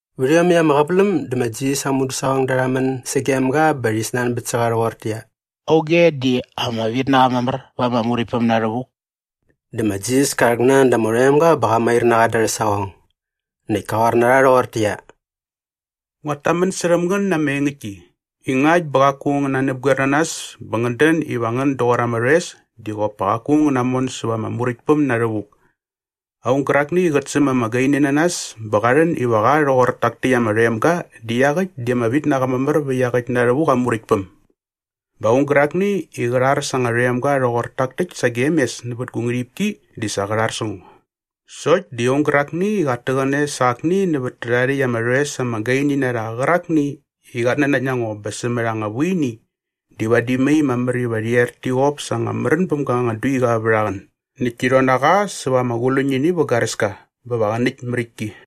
Vät iomäkt ama qäväläm dä ma Jisas aa mudäsaqongda rha män sagem ga bä rhi snanbät sä qa rhoqortäqyia, “Auge di ama vit na qa mamär va ama Muräktpäm na rhävuk?” Dä ma Jisas ka rhäknan da ama rhoemga bä qa mair na qa da arhä saqong. Näkt ka qoar na rha rhoqortäqyia, “Nguat tamän särhäm ngän na ama engäktki i ngakt bä qaku ngän nanäpgoer na nas bä ngän dän iva ngän doqor ama rhoes di qop pa qaku ngän namon säva ama Muräktpäm na rhävuk. Aung gärakni i qät säm ama gaini na nas bä qa rhän iva qa rhoqor tak täkt ama rhoemga di iaqäkt di ama vit na qa mamär vä iaqäkt na rhävuk aa Muräktpäm. “Bä aung gärakni i qä rhar sa anga rhoemga rhoqor tak täkt sagem mes nävät gu ngärhipki di sa qä rhar sä ngo. Sokt di aung gärakni i qat täqäne sa akni nävät tärhae rhäkt ama rhoes ama gaini na rha qärakni i qat nanakt na ngo bä sämät anga vuini di vadi mai mamär iva rhi er ti qop sa anga märän bäm ga anga duiqa vät aa qän näkt ti rhon na qa säva ama quluñini vä garäska bä va qä näkt märäktki.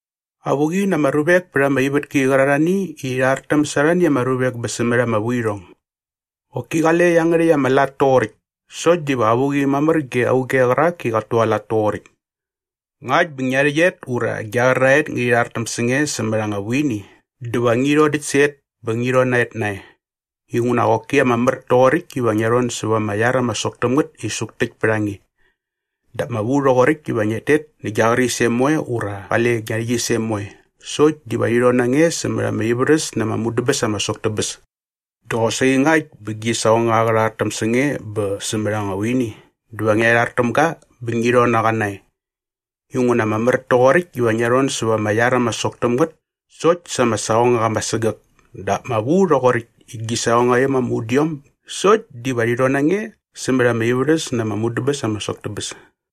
“Avuqi na ama ruvek pät ama ivätki qärarhani i rhi rhartäm sa arhani ama ruvek bä sämät ama vuirhong. Qoki qale iangärhäkt ama lat toqoräkt sokt diva avuqi mamär ge auge qärak i qat tualat toqoräkt. “Ngakt bä ngia rhäqyet ura gia qäraet ngärhi rhartäm sä nge sämät anga vuini dä va ngi rhodäkt sä et bä ngi rhon na et nae. Inguna qoki ama mär toqoräkt iva ngia rhon säva ama iar ama sok täm ngät i suktäkt pät a nge. Dap ama vu rhoqoräkt iva ngiat tet nä gia qärisem moe ura qale gia rhäqyisem moe sokt diva rhi rhon na nge sämät ama ivärhäs na ama mudäbäs ama sok tä bäs. Dä qosaqi ngakt bä gi saqongaqa qä rhartäm sä nge bä sämät anga vuini dä va ngia rhar täm ga bä ngi rhon na qa nae. Inguna ama mär toqoräkt iva ngia rhon säva ama iar ama sok täm ngät sokt sa ama saqongaqa ama sägäk dap ama vu rhoqoräkt i gi saqongaiom ama udiom sokt diva rhi rhon na nge sämät ama ivärhäs na ama mudäbäs ama sok tä bäs.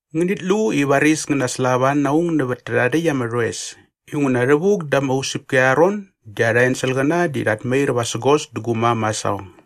“Ngänit lu i varis ngän naslava na aung nävät tärhae rhäkt ama rhoes inguna rhävuk da ama usäpki arha ron di arha enselqäna di rhat mair vasägos dä gu mam aa saqong.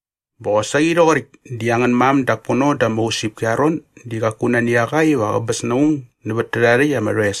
Bä qosaqi rhoqoräkt di angän mam dak pono da ama usäpki arha ron di qaku nani a qa iva qäbäs na aung nävät tärhae rhäkt ama rhoes.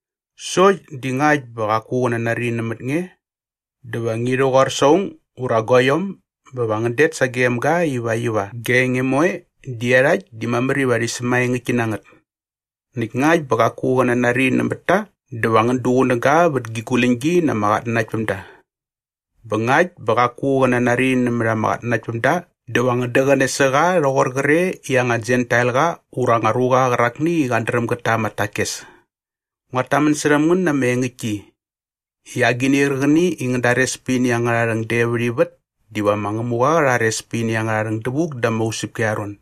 Sokt di ngakt bä qaku qä nanari nämät nge dä va ngi rhäqoar sa aung ura guaiom bä va ngän det sagem ga ivakt iva gia enge moe di iarhakt di mamär iva rhi sämaengäktki na ngät. Näkt ngakt bä qaku qä nanari nämät ta dä va ngän duqunäga vät gi guläñgi na ama qatnanaktpämda. Bä ngakt bä qaku qä nanari nämät ama qatnanaktpämda dä va ngän däqäne sä qa rhoqor qre i anga Jentailqa ura anga ruqa qärakni i qat dräm gät ta ama takes. “Nguat tamän särhäm ngän na ama engäktki i agini qärqäni i ngän dares pät ini angärha rhäng de vät ivät diva ma Ngämuqa qä rhares pät ini angärha rhäng dävuk da ama usäpki arha ron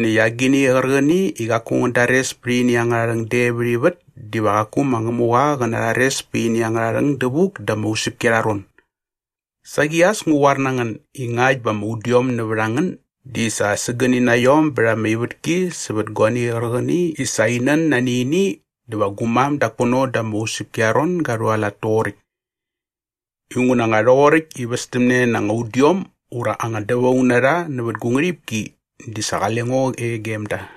näkt agini qärqäni i qaku ngän dares pät ini angärha rhäng de vät ivät diva qaku ma Ngämuqa qä narhares pät ini angärha rhäng dävuk da ama usäpki arha ron. Saqi as ngu qoar na ngän i ngakt bä ama udiom nävät a ngän di sa sägäni na iom bät ama ivätki sävät guani qärqäni i sa in nän nani ini dä va gu mam dak pono da ama usäpki arha ron ga rhualat toqoräkt. Inguna nga rhoqoräkt i västämne na anga udiom ura anga dävaung na rha nävät gu ngärhipki di sa qale ngo e gem da.”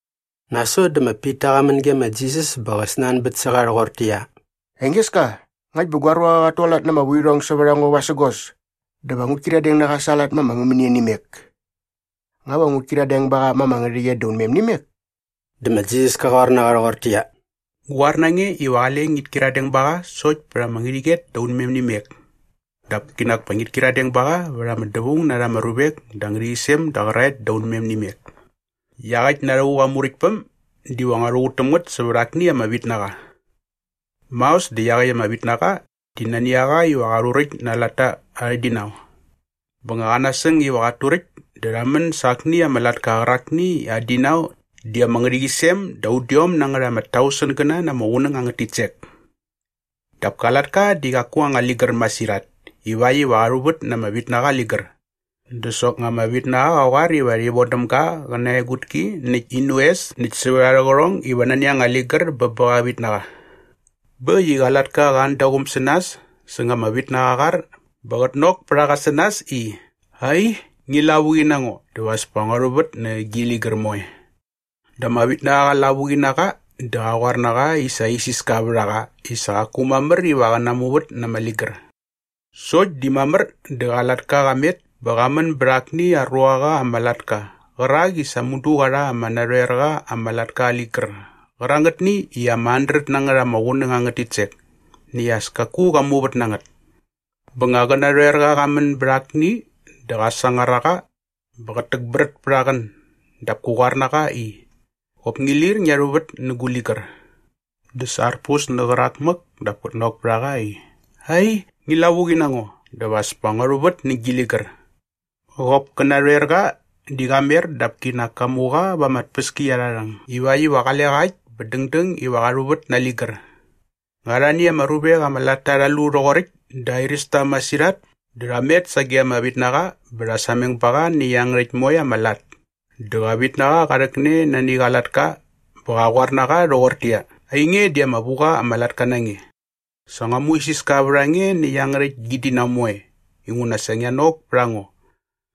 Nasot dä ma Pita qa män ge ma Jisas bä qä snanbät sä qa rhoqortäqyia, “Engeska, ngakt bä gua ruaqa qat tualat na ama vuirhong sävät a ngo vasägos dä va ngut kyiradeng na qa sa aa lat ma ama mämänia nä imek? Nga va ngut kyiradeng ba qa ma ama ngärhäqyet da unmem nä imek?” Dä ma Jisas ka qoar na qa rhoqortäqyia, “Ngu qoar na nge iva qale ngit kyiradeng ba qa sokt pät ama ngärhäqyet da unmem nä imek dap kinak pa ngit kyiradeng ba qa vät ama dävaung na rha ama ruvek da ama ngärhäqyisem da qäraet da unmem nä imek.” “Iaqäkt na rhävuk aa Muräktpäm diva ngua rhuqut täm ngät sävät akni ama vitnaqa. Maos dä iaqäkt ama vitnaqa di nani a qa iva qa rhuräkt na aa latta arhä dinau. Bä nga qa nasäng iva qat turäkt dä rha män sa akni ama latka qärakni i aa dinau di ama ngärhäqyisem da udiom na ngät ama tausengäna na ama qunäng angät titsek. Dap ka latka di qaku aa anga ligär masirhat ivakt iva qa rhuvät na ama vitnaqa aa ligär. Dä soknga ama vitnaqa qa qoar iva rhi vodäm ga qä na aa egutki näkt in oes näkt sävät arhä qärhong iva nani anga ligär bä bä qa vitnaqa. “Bä äkt i qa latka qa an da aa quum sä nas säng ama vitnaqa aa qar bä qät nok pät a qa sä nas i, ‘Ai, ngi lavuqi na ngo dä va as pa ngua rhuvät nä gi ligär moe.’ Dä ama vitnaqa qa lavuqi na qa dä qa qoar na qa i sa isiska vät a qa i sa qaku mamär iva qä namuvät na ama ligär. “Sokt di mamär dä qa latka qa met bä qa män bät akni aa ruaqa ama latka qärak i sa mudu qa rha ama narhoerqa ama latka aa ligär qärangätni i ama handret na ngät ama qunäng angät titsek näkt as kaku qa muvät na ngät. Bä nga qä narhoerqa qa män bät akni dä qa sangar a qa bä qät täkbrät pät aa qän dap kä qoar na qa i, ‘Qop ngi lir ngia rhuvät nä gu ligär!’ “Dä sa arpus nä qärak mäk dap kät nok pät a qa i, ‘Ai, ngi lavuqi na ngo dä va as pa ngua rhuvät nä gi ligär.’ Qop kä narhoerqa di qa mer dap kinak ka mu qa va ama tpäskiarharhäng ivakt iva qale qa äkt bä dängdäng iva qa rhuvät na aa ligär. “Nga arhani aa ruavek ama latta rha lu rhoqoräkt dä airäs ta masirhat dä rha met sage ama vitnaqa bä rha sameng ba qa nä iangärhäkt moe ama lat. Dä qa vitnaqa qa rhäkne nani qa latka bä qa qoar na qa rhoqortäqyia, ‘Ainge di ama vu qa ama latka na nge. Sa ngua muisiska vät a nge nä iangärhäkt gi dinau moe inguna sa ngia nok pät a ngo.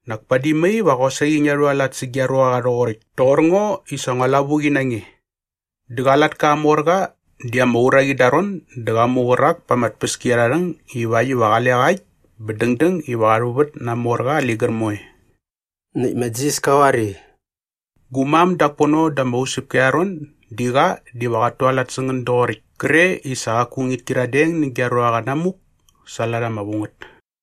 Näkt padi mai va qosaqi ngia rhualat sä gia ruaqa rhoqoräkt toqor ngo i sa ngua lavuqi na nge.’ Dä qa latka aa morqa di ama uraqi da aa ron dä qa mu qärak pa ama tpäskiarharhäng ivakt iva qale qa äkt bä dängdäng iva qa rhuvät na aa morqa aa ligär moe.” Näkt ma Jisas ka qoar i, “Gu mam dak pono da ama usäpki arha ron di qa diva qat tualat sä ngän doqoräkt kre i sa qaku ngit kyiradeng nä gia ruaqa namuk sa aa lat ama vu ngät.”